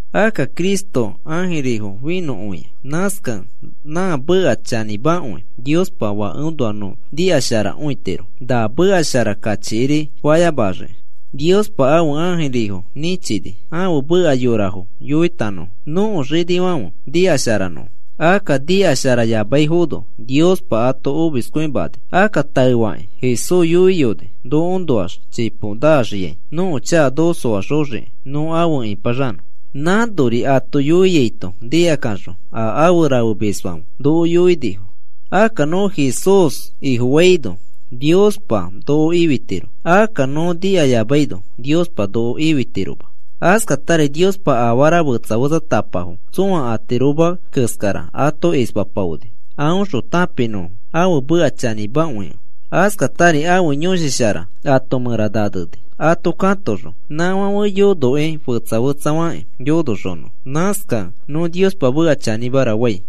Akka Cristo ãjirifo finõkõia. Nãskakẽ nã meka chanĩmakõi Niospa Fakeõnoa nõ nikasharakõitiro, na meka shara kachikiri fayamaxiki. Niospa ãfe ãjirifo nĩchini ãfe meka yorafo yoitanõfo nõko xinifãfe nikasharanõfo. Akka nikasharayamaifono Niospa ato omiskõimani. Akka taefakĩ Jesús yoiyoni nokoõnoax chipo naxiai, nõko chaka noko soaxoxiki nõ afe ĩpaxanõ. Nãnori ato yoiaito nikakaxõ a afe rafemisfãfe noko yoinifo. Akka nõ Jesús Ifofaino, Niospa noko ifitiro. Akka nõ nikayamaino Niospa noko ifitiroma. Askatari Niospa afara fetsa fetsatapafo tsõa atiroma keskara ato ispapaoni aõxõ tãpinõfo ãfe meka chanĩmakõikẽ. Askatari ãfe Yõshi Shara ato mẽra naneni ato katoxõ nãfãfe yonokĩ fetsa fetsafakĩ yonoxonõfo. Nãskakẽ nõ Niospa meka chanĩmara fai.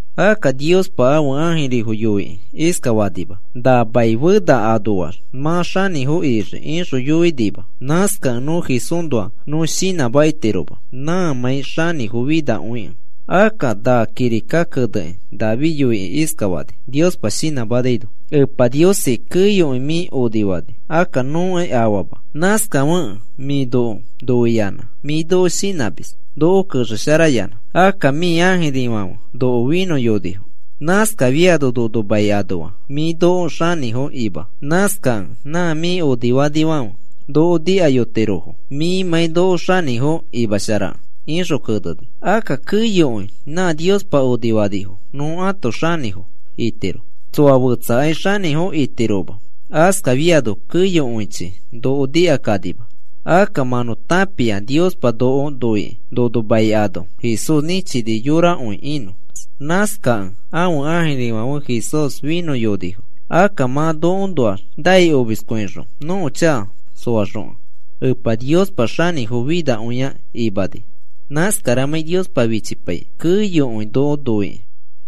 Akka Niospa ãfe ãjirifo yoikĩ iskafanima: “Na mai fena anoax mã xanĩfo ixii,” ixõ yoinima. (Nãskakẽ nõ Jesúsnoa nõ shinãmakitiroma nãmãi xanĩfofinakõikẽ.) Akka na kirika kenekĩ David yoikĩ iskafani Niospa shinãmanaino: Epa Niosi, keyokõi mĩ onifani. Akka nõkai afama. Nãskafekẽ mĩ noko noiyanã mĩ noko shinãmis, noko kexesharayanã. Akka mĩ ãjirifãfe noko finõyonifo. Nãskafiano nono mai anoa mĩ noko xanĩfo ima. Nãskakẽ nã mĩ onifanifãfe noko nikakõitirofo mĩmãi noko xanĩfo imasharakẽ, ixõ keneni. Akka keyokõi nã Niospa onifanifo nõ ãto xanĩfo itiro. Tsoa fetsakai xanĩfo itiroma. Askafiano keyokõichi noko nikakanima. Akka mã nõ tãpia Niospa noko noikĩ nono mai ano Jesús nĩchini yorakõi inõ. Nãskakẽ ãfe ãjirifãfe Jesús finõyonifo. Akka mã nokoõnoax nai omiskõixõ noko chaka soaxokẽ. Epa Niospa xanĩfo finakõi imani, nãskaramãi Niospa fichipaikĩ keyokõi noko noikĩ.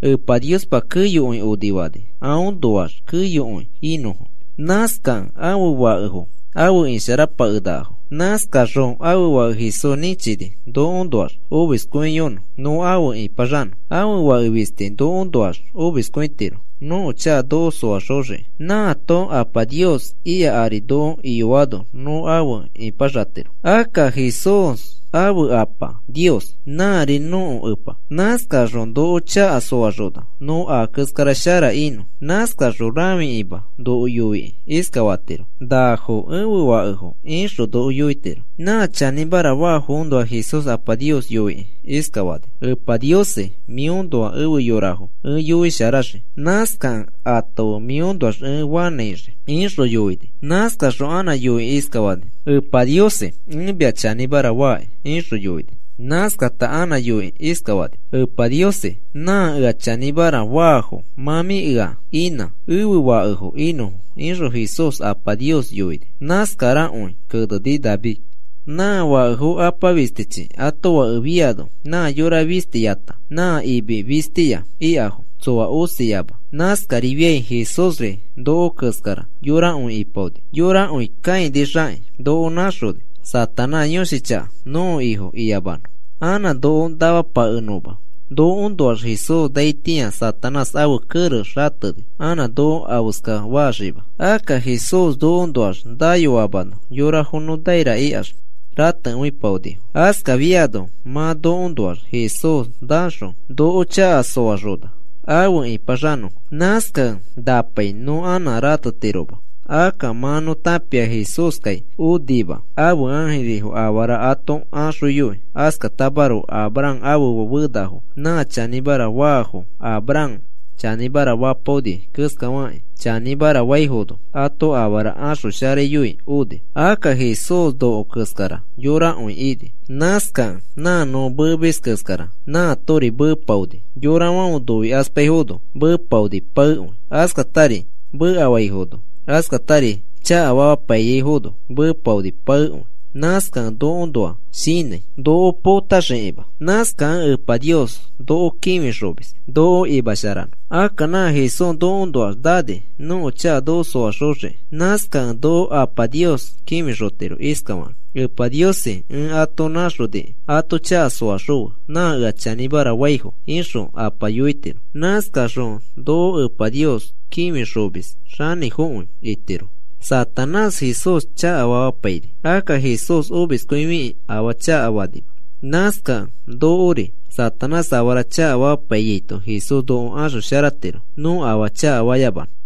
Epa Niospa keyokõi onifani aõnoax keyokõi inõfo. Nãskakẽ ãfe fakefo afe isharapakenakafo. Nãskaxõ ãfe Fake Jesús nĩchini nokoõnoax omiskõiyonõ nõ afe ĩpaxanõ. Ãfe Fake fisti nokoõnoax omiskõitiro nõko chaka noko soaxoxiki. Nãato Apa Nios ika ari noko iyoano nõ afe ipaxatiro. Akka Jesús ãfe Apa Nios nãri nõko Epa. Nãskaxõ noko chaka soaxona nõ a keskara shara inõ. Nãskaxõ rãfikima noko yoikĩ iskafatiro: “Nafo ẽfe fakefo,” ixõ noko yoitiro. Nã chanĩmara faafoõnoa Jesús Apa Nios yoikĩ iskafani: Epa Niosi, mĩõnoa efe yorafo ẽ yoisharaxii. Nãskakẽ ato fe mĩõnoax ẽ fanãixii, ixõ yoini. Nãskaxõ anã yoikĩ iskafani: Epa Niosi, ẽ mia chanĩmara faaki, ixõ yoini. Nãskafata anã yoikĩ iskafani: Epa Niosi, nã ea chanĩmara faafo mã mĩ ea inã ẽfe fakefo inõfo, ixõ Jesús Apa Nios yoini. Nãskarakõi keneni David. Nã fakefo apa fistichi ato fake fafĩano nã yora fistiyata nã imi fistiya ikafo tsoa osiama. Nãskarifiai Jesúsri noko keskara yorakõi ipaoni. Yorakõi kãinixakĩ noko nãxoni Satanás yõshi chaka nõko ifo iyamanõ anã noko namapakenõma. Nokoõnoax Jesús naitĩa Satanás ãfe kerex xateni anã noko afeska faxima. Akka Jesús nokoõnoax nayoamano yorafo nõ naira ikax ratekõipaonifo. Askafiano mã nokoõnoax Jesús naxõ noko chaka soaxona afe ĩpaxanõfo. Nãskakẽ napai nõ anã ratetiroma. Akka mã nõ tãpia Jesúskai onima ãfe ãjirifo afara ato axoyoi. Askatamaroko Abraham ãfe fenafo nã chanĩmara faafo, Abraham chanĩmara fapaoni keskafakĩ chanĩmara faifono ato afara axosharayoi oni. Akka Jesús noko keskara yorakõi ini. Nãskakẽ nã nõ meemis keskarari arifi meepaoni. Yorafãfe noikaspaifono meepaoni paekõi. Askatari mekafaifono, askatari chakafamapaiyaifono, meepaoni paekõi. Nãskakẽ nokoõnoa shinãi. Noko potaxikima. Nãskakẽ Epa Nios noko kĩfixomis noko imasharanõ. Akka nã Jesús nokoõnoax nani nõko chaka noko soaxoxiki. Nãskakẽ noko Apa Nios kĩfixotiro iskafakĩ: “Epa Niosi, ẽ ato nãxonikĩ ato chaka soaxõfe nã ea chanĩmara faifo,” ixõ Apa yoitiro. Nãskaxõ noko Epa Nios kĩfixomis xanĩfokõi itiro. Satanás Jesús chakafamapaini. Akka Jesús omiskõifikĩ afaa chakafanima. Nãskakẽ nokori Satanás afara chakafamapaiyaito Jesús noko axosharatiro nõ afaa chakafayamanõ.